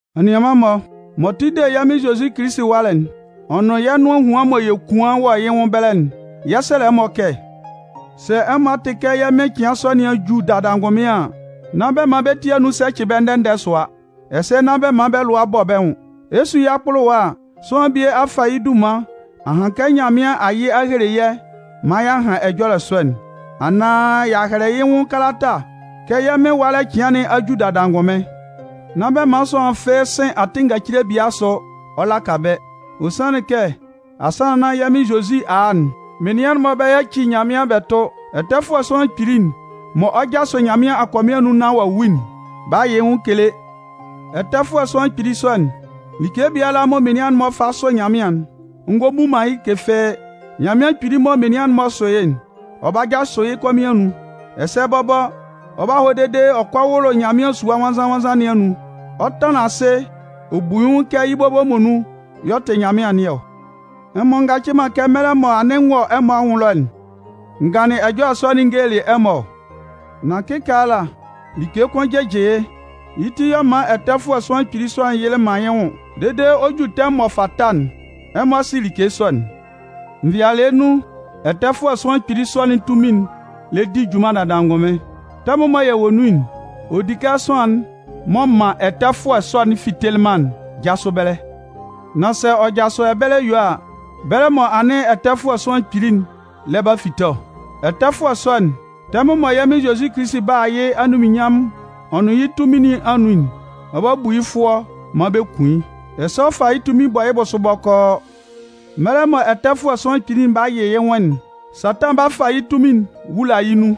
Anianman-mɔ, m'ɔ tʋ de yɛ́ Mɩn Zozi Kilisi ɛwalɛ'n, ɔ nʋn yɛ́ nʋan ehuan mɔ yɛ 'kuan wɔ yɩ́ nwʋn ɛbɛlɛ'n, yɛ 'sɛlɛ ɛmɔ kɛ sɛ ɛmɔ a tɩ kɛ yɛ́ Mɩn cɩan sɔ nɩn a ju dada angʋnmɩn an, nán bɛ man bɛ́ ti anun sɛcɩ bɛ́ ndɛ-ndɛ sʋa, ɛsɛ nán bɛ man bɛ́ lʋa bɔ bɛ́ nwʋn. Ɛ 'su yɩ́ akpʋlʋwa a, sʋanlan bie a fa yɛ́ dunman a han kɛ Nyanmɩan a yɩ a hele yɛ́ maan y'a han ɛjɔlɛ sɔ'n, anaan y'a hɛlɛ yɩ́ nwʋn kalata kɛ yɛ́ Mɩn ɛwalɛ cɩan nɩn a ju dada angʋnmɩn. Nán bɛ man sʋanlan fɩ́ɩ́ sɩn atɩn ngacile biala asʋ ɔ laka bɛ́. Ɔ sanlɩn kɛ asannan nan yɛ́ Mɩn Zozi a a'n, menian'n-mɔ 'ba yaci Nyanmɩan bɛ tʋ, Ɛtɛfʋɛ Sʋanlan Kpili'n mɔ ɔ 'jasʋ Nyanmɩan akɔmɩn anun nán ɔ wu'n 'ba yɩ yɩ nwʋn kele. Ɛtɛfʋɛ Sʋanlan Kpili sɔ'n, like biala mɔ menian'n-mɔ fa sʋ Nyanmɩan'n, ɔ ngɔ bu man yɩ́ like fɩ́ɩ́. Nyanmɩan Kpili mɔ menian'n-mɔ sʋ yɩ́'n, ɔ 'ba jasʋ yɩ́ kɔmɩn anun. Ɛsɛ bɔbɔ, ɔ 'ba hɔ dede ɔ kɔ wʋlʋ Nyanmɩan Sua Nwannzan-nwannzan nɩn anun, ɔ 'tanlan asɩ ɔ bu yɩ́ nwʋn kɛ yɩ́ bɔbɔ muonun y'ɔ tɩ Nyanmɩan nɩn ɔ. Ɛmɔ ngacɩ man kɛ mɛlɛ mɔ anɩn n wɔ ɛmɔ anwʋn ɛlɔ'n, n ganlɩn ɛjɔlɛ sɔ'n n gelelɩ ɛmɔ ɔ? Nan kɩkaala, like kʋn jɩjɩ yɩ́, yɩ́ ti yɛ̂ ɔ man Ɛtɛfʋɛ Sʋanlan Kpili sɔ'n yɩlɩ man yɩ́ nwʋn dede ɔ 'ju tɛmʋn m'ɔ fata'n, ɛmɔ sɩ like sɔ'n. Nvɩalɩɛ nun, Ɛtɛfʋɛ Sʋanlan Kpili sɔ'n tunmin'n lɛ di junman dada angʋnmɩn. Tɛmʋn mɔ yɛ wɔ nun'n, ɔ di kɛ sʋanlan'n m'ɔ man Ɛtɛfʋɛ sɔ'n fitelɩ man'n jasʋ ɛbɛlɛ. Nan sɛ ɔ jasʋ ɛbɛlɛ yue a, bɛlɛ mɔ anɩn Ɛtɛfʋɛ Sʋanlan Kpili'n lɛ ba fite ɔ. Ɛtɛfʋɛ sɔ'n, tɛmʋn mɔ yɛ́ Mɩn Zozi 'ba a yɩ́ anunminnyanmʋn ɔ nʋn yɩ́ tunmin nɩn anun'n, ɔ 'ba bu yɩ́ fʋɔ maan bɛ kun yɩ́, ɛsɛ ɔ 'fa yɩ́ tunmin bɔ yɩ́ bʋsʋ bɔkɔɔ. Mɛlɛ mɔ Ɛtɛfʋɛ Sʋanlan Kpili'n 'ba yɩ yɩ́ nwʋn'n, Satan 'ba fa yɩ́ tunmin'n wula yɩ́ nun.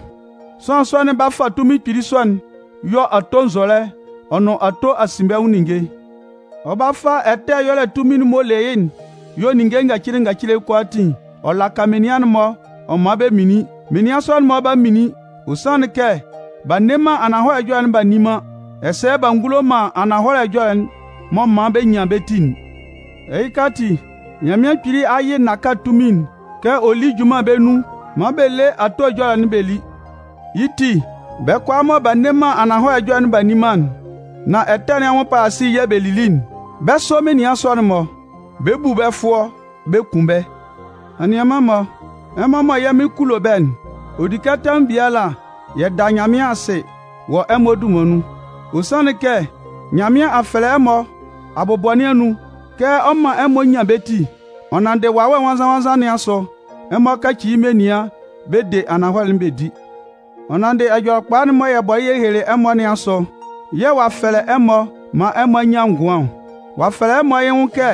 Sʋanlan sɔ'n 'ba fa tunmin kpili sɔ'n yɔ ato nzɔlɛ ɔ nʋn ato asinbɛnwʋn ninnge. Ɔ 'ba fa ɛtɛ ɛyɔlɛ tunmin'n m'ɔ le yɩ́'n yɔ ninnge ngacile kʋalaatin ɔ laka menian'n-mɔ ɔ man bɛ minlin. Menian sɔ'n-mɔ 'ba minlin, ɔ sanlɩn kɛ b'a nne man ananhɔlɛ ɛjɔlɛ'n b'a nni man, ɛsɛ b'a ngulo man ananhɔlɛ ɛjɔlɛ'n m'ɔ man bɛ nyan bɛ́ ti'n. Ɛhɩka ati, Nyanmɩan Kpili a yɩ nnaka tunmin'n kɛ ɔ lí junman bɛ́ nun maan bɛ lé ato ɛjɔlɛ'n bɛ lí. Yɩ́ ti, bɛ́ kʋalaa mɔ b'a nne man ananhɔlɛ ɛjɔlɛ'n b'a nni man'n, nan ɛtɛ nɩn anwʋn palasili yɛ̂ bɛ lili'n, bɛ́ sɔ menian'n-mɔ, bɛ 'bu bɛ́ fʋɔ bɛ kun bɛ́. Anianman-mɔ, ɛmɔ mɔ yɛ́ Mɩn kulo bɛ́'n, ɔ di kɛ tɛmʋn biala yɛ da Nyanmɩan asɩ wɔ ɛmɔ dunman nun. Ɔ sanlɩn kɛ Nyanmɩan a fɛlɛ ɛmɔ abʋbɔ nɩn anun kɛ ɔ 'man ɛmɔ nyan bɛ́ ti, ɔ nanndɩ Wawɛ Nwannzan-nwannzan nɩn asʋ, ɛmɔ kaci yɩ́ menian bɛ de ananhɔlɛ'n bɛ di. Ɔ nanndɩ Ɛjɔlɛkpa'n mɔ yɛ bɔlɩ yɛ helelɩ ɛmɔ nɩn asʋ yɛ̂ ɔ'a fɛlɛ ɛmɔ maan ɛmɔ a nyan ngʋan ɔ. Ɔ'a fɛlɛ ɛmɔ yɩ́ nwʋn kɛ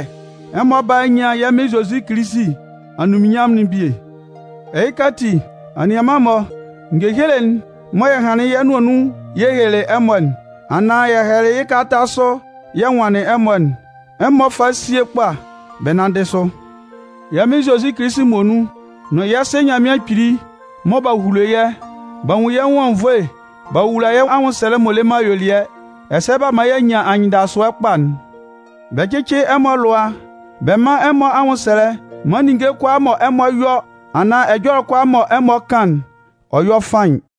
ɛmɔ bála a nyan yɛ́ Mɩn Zozi Kilisi anunminnyanmʋn'n bie. Ɛhɩka ati, anianman-mɔ, ngehele'n mɔ yɛ hanlɩn yɩ́ yɛ́ nʋan nun yɛ helelɩ ɛmɔ anaan yɛ hɛlɛlɩ yɩ́ kalata sʋ yɛ nwanlɩn ɛmɔ'n, ɛmɔ fá síe kpa bɛ nánndɩ sʋ. Yɛ́ Mɩn Zozi Kilisi muonun nʋn yɛ́ Sɩ Nyanmɩan Kpili mɔ b'a hulo yɛ́, b'a nwun yɛ́ nwʋn anwunnvoe b'a wowula yɛ́ anwʋnsɛlɛ m'ɔ le man ayuelɩɛ, ɛsɛ b'a man y'a nyan anyɩndasʋɛ kpa'n. Bɛ cɩ́cɩ ɛmɔ alʋa bɛ mán ɛmɔ anwʋnsɛlɛ maan ninnge kʋalaa mɔ ɛmɔ 'yɔ anaan ɛjɔlɛ kʋalaa mɔ ɛmɔ 'kan'n, ɔ yɔ́ faɩn.